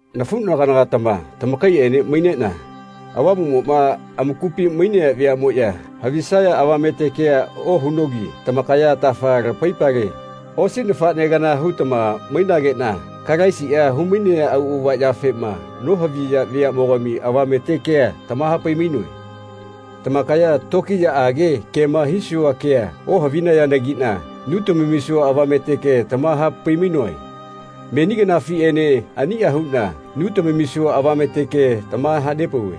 Nafuꞌnagana-gatama tamakaiꞌene maineꞌna, Avamuꞌmoꞌma amakupi mainea veaꞌmoꞌya havisaya avamete kea ohunogi tamakaya atafa lamaipale, osi nafaꞌne kana hutama mainageꞌna Kalaisi humainea auꞌava yafema nohavinaya veaꞌmogami avamete kea tamahapai-mainoe. Tamakaya tokiyaꞌage kema hisua kea ohavigahayanagiꞌna nu tamamisua avamete ke tamahapai-mainoe. Meni kanafiꞌenena aniꞌa huꞌna nu tamamisua avamete ke tamahanepauve.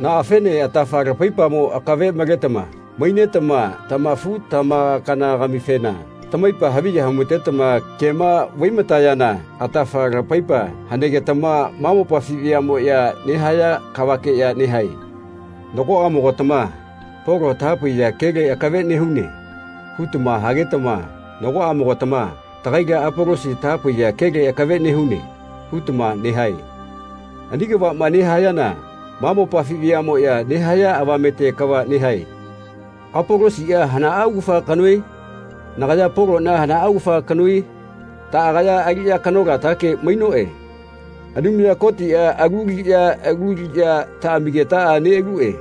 Naꞌafene atafa lamaipamo akave maletama mainetama tamafu-tamakana-gamifena tamaipa haviya humatetama kema vaimatayana atafa lamaipa hanegetama ma mopafi veaꞌmoꞌya nehaya kavakeꞌya nehae. Nagoꞌamogatama “Polo tahapaiya kele akave nehune.” hutama hagetama nagoꞌamogatama “Tagaila Apolosi tahapaiya kele akave nehune.” hutama nehae. Ani kavaꞌma nehayana ma mopafi veaꞌmoꞌya nehaya avamete kava nehae. Apolosiꞌa hanaꞌa augafa kanoe? Nagaya Poloꞌna hanaꞌa augafa kanoe? Taꞌagaya aliꞌya kanolatake mainoꞌe. Anumaya Kotiꞌa alu aliꞌya lu aliꞌya taꞌamigetaꞌa neꞌaluꞌe.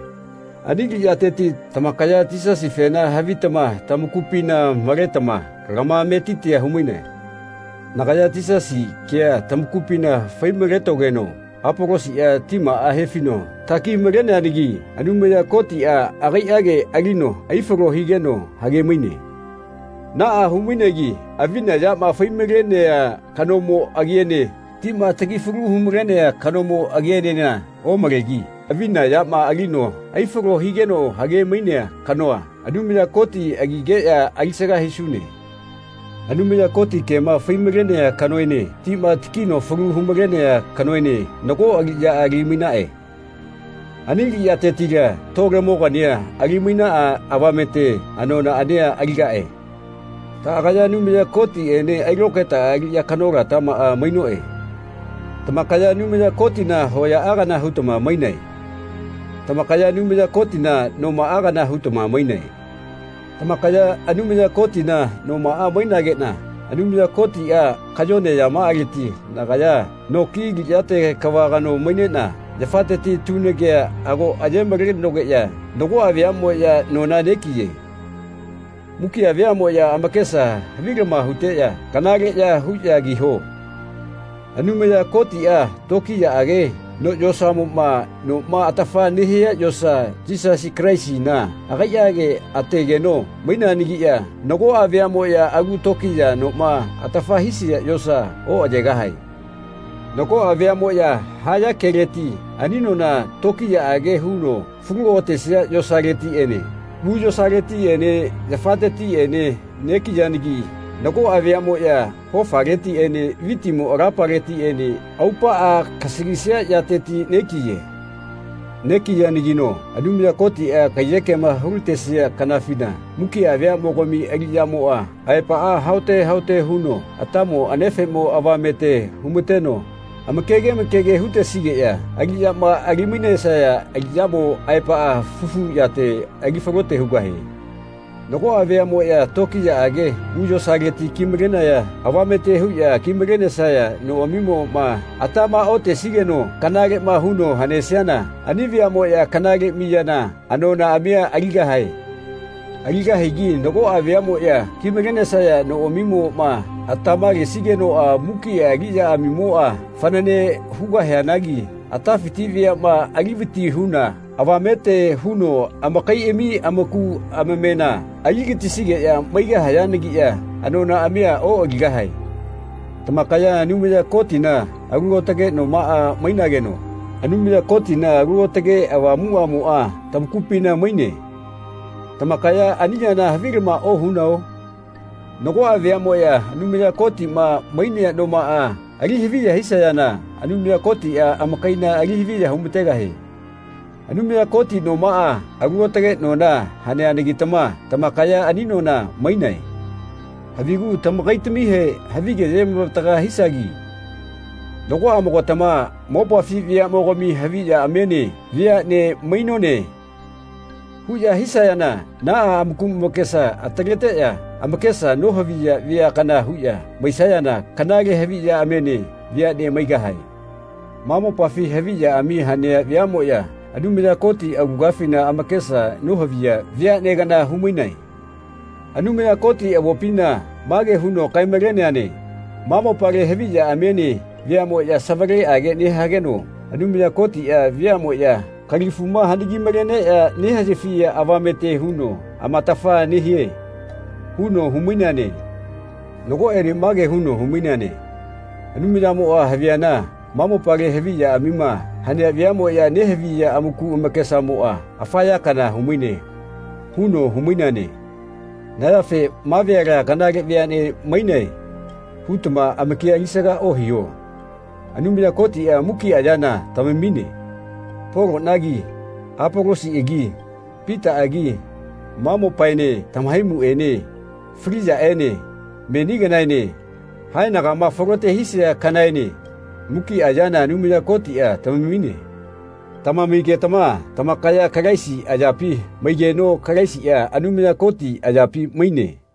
Ani aliꞌyateti tamakaya Yisasifena havitama tamakupina maletama lamametitia humainae. Nagaya Yisasi kea tamakupina fai-maletogeno Apolosiꞌa timaꞌa hefino taki-maleneanagi Anumaya Kotiꞌa agaiꞌage alino aifalo higeno hagemaine. Naꞌa humainegi avina yama fai-malenea kanomo agiene tima taki falu hu-malenea kanomo agienena omalegi avina yama alino aifalo higeno hage-mainea kanoa, Anumaya Koti agigeꞌya alisaga hisune. Anumaya Koti kema faimalenea kanoene tima takino falu humalenea kanoene nago aliꞌya alimainaꞌe. Ani aliꞌyatetila tolemogania ali-mainaꞌa avamete anonaꞌania aligaꞌe. Taꞌagaya Anumaya Kotiꞌene ailokaetaꞌa aliꞌya kanolatamaꞌa mainoꞌe. Tamakaya Anumaya Kotina hoyaꞌa kana hutama mainae. Tamakaya Anumaya Kotina nomaꞌa kana hutama mainae. Tamakaya Anumaya Kotina nomaꞌa mainageꞌna Anumaya Kotiꞌa kayone yamaꞌaleti nagaya no ki aliꞌyate kava kano maineꞌna yafateti tunagea ago ayemalenogeꞌya nagoꞌa veaꞌmoꞌya nona negiye. Mukiꞌa veaꞌmoꞌya amakesa havilama huteꞌya kanaleꞌya huꞌya kiho. Anumaya Kotiꞌa tokiyaꞌage no yosamoꞌma noma atafa nehia yosa Yisasi Kalaisina agaiꞌage ategeno maineanagiꞌya nagoꞌa veaꞌmoꞌya alu tokiya noma atafa hisia yosa oꞌayegahae. Nagoꞌa veaꞌmoꞌya haya keleti ani nona tokiyaꞌage huno falu otesia yosaletiꞌene u yosaletiꞌene yafatetiꞌene negiyanagi nagoꞌa veaꞌmoꞌya hofaletiꞌene vitimo alapaletiꞌene aupaꞌa kasalisia yateti negiye. Negiyanagino Anumaya Kotiꞌa kaiyekema hulatesia kanafina mukiꞌa veaꞌmogami aliꞌyamo aepaꞌa haote haote huno atamo anefeꞌmo avame humateno amakege amakege hutesigeꞌya aliꞌyama ali-mainesaya aliꞌyamo aepaꞌa fufu yate ali falote hugahie. Nagoꞌa veaꞌmoꞌya tokiyaꞌage u yosaleti kimalenaya avamete huꞌya ki-malenesaya noꞌamimoꞌma atama otesigeno kanaleꞌma huno hanesiana ani veaꞌmoꞌya kanale miyana anonaꞌamia aligahae. Aligahagi nagoꞌa veaꞌmoꞌya ki-malesaya noꞌamimoꞌma atama lesigenoꞌa mukiꞌa aliꞌyamaꞌamimoꞌa fanane hugahianagi atafiti veaꞌma ali vati huna avamete huno amakaiꞌami amaku amamena aligatisigeꞌya maigahayanagiꞌya anonaꞌamia oꞌaligahae. Tamakaya Anumaya Kotina alu aotage nomaꞌa mainageno Anumaya Kotina Alu Aotake Avamuꞌamoꞌa tamakupina maine. Tamakaya ani yana havilama ohunao? Nagoꞌa veaꞌmoꞌya Anumaya Kotiꞌma mainea nomaꞌama ali haviya hisayana Anumaya Kotiꞌa amakaina ali haviya humategahie. Anumaya Koti nomaꞌa alu aotage nona haneanagitama tamakaya ani nona mainae. Havigu tamakaitamihe havige ayemavataga hisagi. Nagoꞌamogatama “Mopafi veaꞌmogami haviꞌyaꞌmiene veaꞌne mainone.” huꞌya hisayana naꞌa amaku amakesa ataleteꞌya amakesa nohaviya vea kana huꞌya maisayana kanale haviꞌyaꞌmiene veaꞌne maigahae. Ma mopafi haviꞌyaꞌami hanea veaꞌmoꞌya Anumaya Koti aulagafina amakesa nohaviya veaꞌne kana humainae. Anumaya Koti avopina mage huno kae-maleneane “Ma mopale haviꞌyaꞌamiene veaꞌmoꞌya savaleꞌage nehageno Anumaya Kotiꞌa veaꞌmoꞌya kalifuma hanagi-maleneꞌya nehaꞌyafiya avamete huno amatafa nehie.” huno humaineane. Nagoꞌene mage huno humaineane “Anumayamoꞌa haviana ma mopale haviꞌyaꞌamima hanea veaꞌmoꞌya nehaviya amaku amakesamoꞌa afa ya kana humaine.” huno humaineane. Na yafe “Ma veala kanale veaꞌne mainae.” hutama amakia alisaga ohiho. Anumaya Kotiꞌa mukiꞌa yana tamamine. Poloꞌnagi, Apolosiꞌagi, Pitaꞌagi, ma mopaene tamahaimuꞌene, fali yaꞌene, meni kanaene, haenagama falote hisia kanaene, mukiꞌa yana Anumaya Kotiꞌa tamamine. Tamamigetama tamakaya Kalaisi ayapi maigeno Kalaisiꞌa Anumaya Koti ayapi maine.